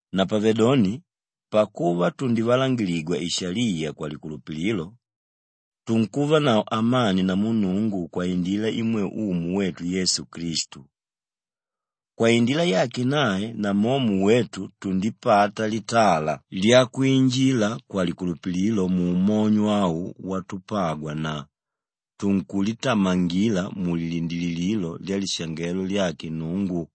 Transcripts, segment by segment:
Napavedoni pakuva tundivalangiligwa ishaliya kwalikulupililo, tunkuvanavo amani namu Nnungu kwaindila imwe Umu wetu Yesu Klistu. Kwaindila yake nae namomo wetu tundipata litala lyakwinjila kwalikulupililo muumonyo au watupagwa na tunkulitamangila mulilindilililo lyalishangelo lyake Nnungu.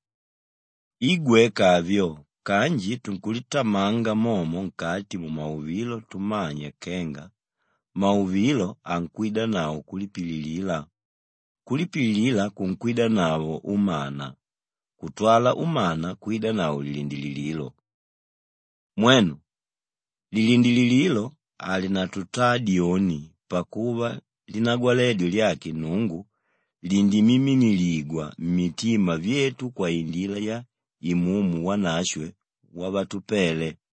I gweka avyo kanji tunkulitamanga momo nkati mumauvilo tumanya kenga mauvilo ankwidanavo kulipililila, kulipililila kunkwidanavo umana kutwala umana kwidanavo lilindilililo. Mwenu, lilindilililo halinatutaa dyoni pakuva linagwaledyo lyake Nnungu lindimiminiligwa mmitima vyetu kwaindila ya Imumu Wanashwe wavatupele.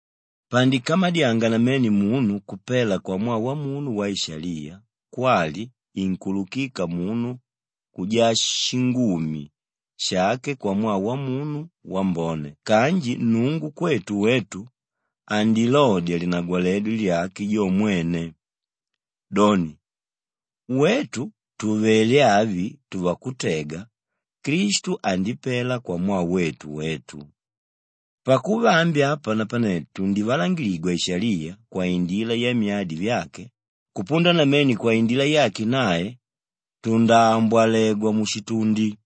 Pandikamadyanga namene munu kupela kwamwaa wamunu waishaliya kwali inkuululika munu kujaa shingumi shake kwamwaa wamunu wambone kanji Nnungu kwetu wetu andilodya linagwaledyo lyake jo mwene, doni, wetu tùvele avi tuvakutega, Klistu andipela kwamwaa wetu wetu. Pakuva ambi apa napane tundivalangiligwa ishaliya kwaindila yamyadi vyake, kupunda namene kwaindila yake nae tundaambwalegwa mushitundi.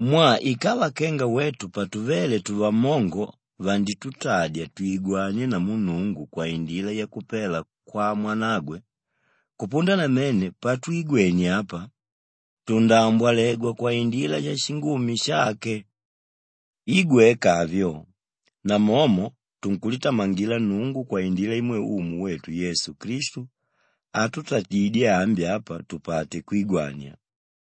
Mwaa ikava kenga wetu patuvéle tuvammongo vanditutadya twigwanie namu Nnungu kwaindila yakupela kwa Mwanagwe, kupunda namene patwigwenie apa, tundaambwalegwa kwaindila yashingumi shake. I gweka avyo, namomo tunkulitamangila Nnungu kwaindila imwe Umu wetu Yesu Klistu átutadidye ambi apa tupate kwigwania.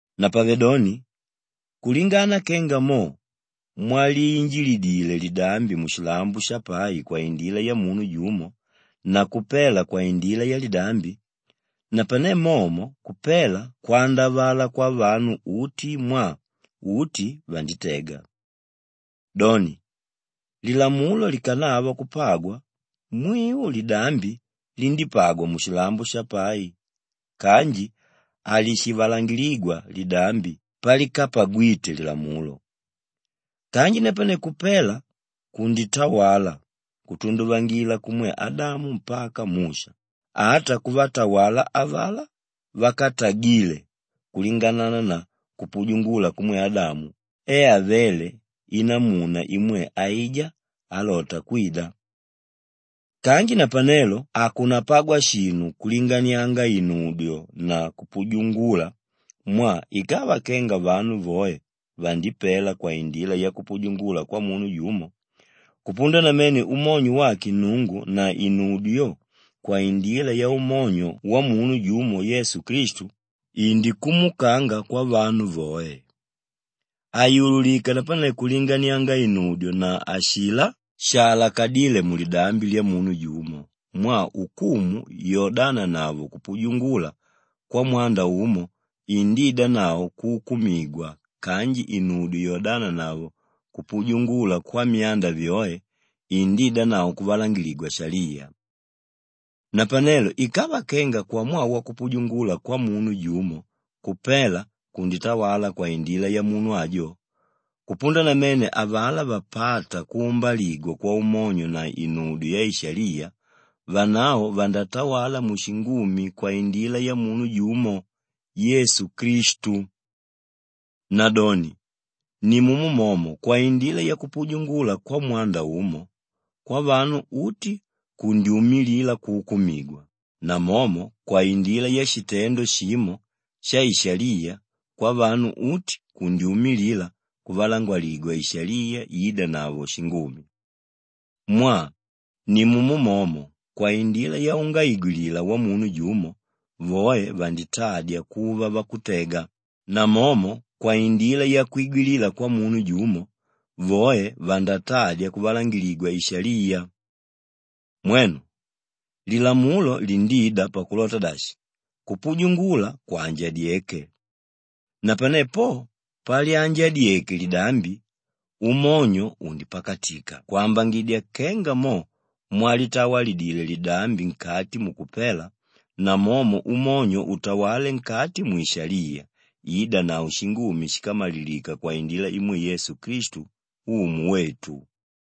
Napavedoni, kulingana kenga mo mwaliinjilidile lidambi mushilambo shapai kwaindila yamunu jumo na kupela kwaindila yalidambi, napane momo kupela kwandavala kwavanu uti mwaa uti vanditega. Doni, lilamulo likanava kupagwa, mwiu lidambi lindípagwa mushilambo shapai kanji halishivalangiligwa lidambi pálikapagwite lilamulo. Kanji napane kupela kunditawala kutunduvangila kumwe Adamu mpaka Musha, ata kuvatawala avalá vákatagile kulingana na kupujungula kumwe Adamu e avéle inamuna imwe aijá álota kwida. Kanji napanelo hakunapagwa shinu kulinganianga inudyo na kupujungula mwaa ikava kenga vanu voe vandipela kwaindila yakupujungula kwamunu jumo, kupunda namene umonyo wake Nnungu na inudyo yo kwaindila yaumonyo wamunu jumo Yesu Klistu, indikumukanga kwavanu voe. Hayululika napane kulinganianga inudyo na ashilá shaalakadíle mulidambi lyamunu jumo mwaa ukumu yodananavo kupujungula kwamwanda umo indiidanavo kuukumigwa kanji inudyo yodananavo kupujungula kwamyanda vyoe indiidanavo kuvalangiligwa ishaliya. Napanelo ikava kenga kwamwaa wakupujungula kwamunu jumo kupela kunditawala kwaindila yamunu ajo, kupunda namene avalá vapáta kuumbaligwa kwaumonyo na inudyo yaishaliya, vanavo vandatawala mushingumi kwaindila yamunu jumo, Yesu Klistu. Nadoni nimumo momo kwaindila yakupujungula kwamwanda umo, kwavanu uti kundyumilila kuukumigwa, namomo kwaindila yashitendo shimo shaishaliya, kwavanu uti kundyumilila kuvalangiligwa ishaliya iidanavo shingumi. Mwaa nimumo momo kwaindila yaungaigwilila wamunu jumo, voe vanditadya kuva vakutega, namomo kwaindila yakwigwilila kwamunu jumo, voe vandatadya kuvalangiligwa ishaliya. Mwenu, lilamulo lindida pakulota dashi, kupujungula kwanjadyeke. Napane po palyanjadyeke lidambi, umonyo undipakatika kwambangidya kenga mo mwalitawalidile lidambi nkati mukupela, namomo umonyo utawale nkati mwishaliya iidanavo shingumi shíkamalilika kwaindila imwe Yesu Klistu Umu wetu.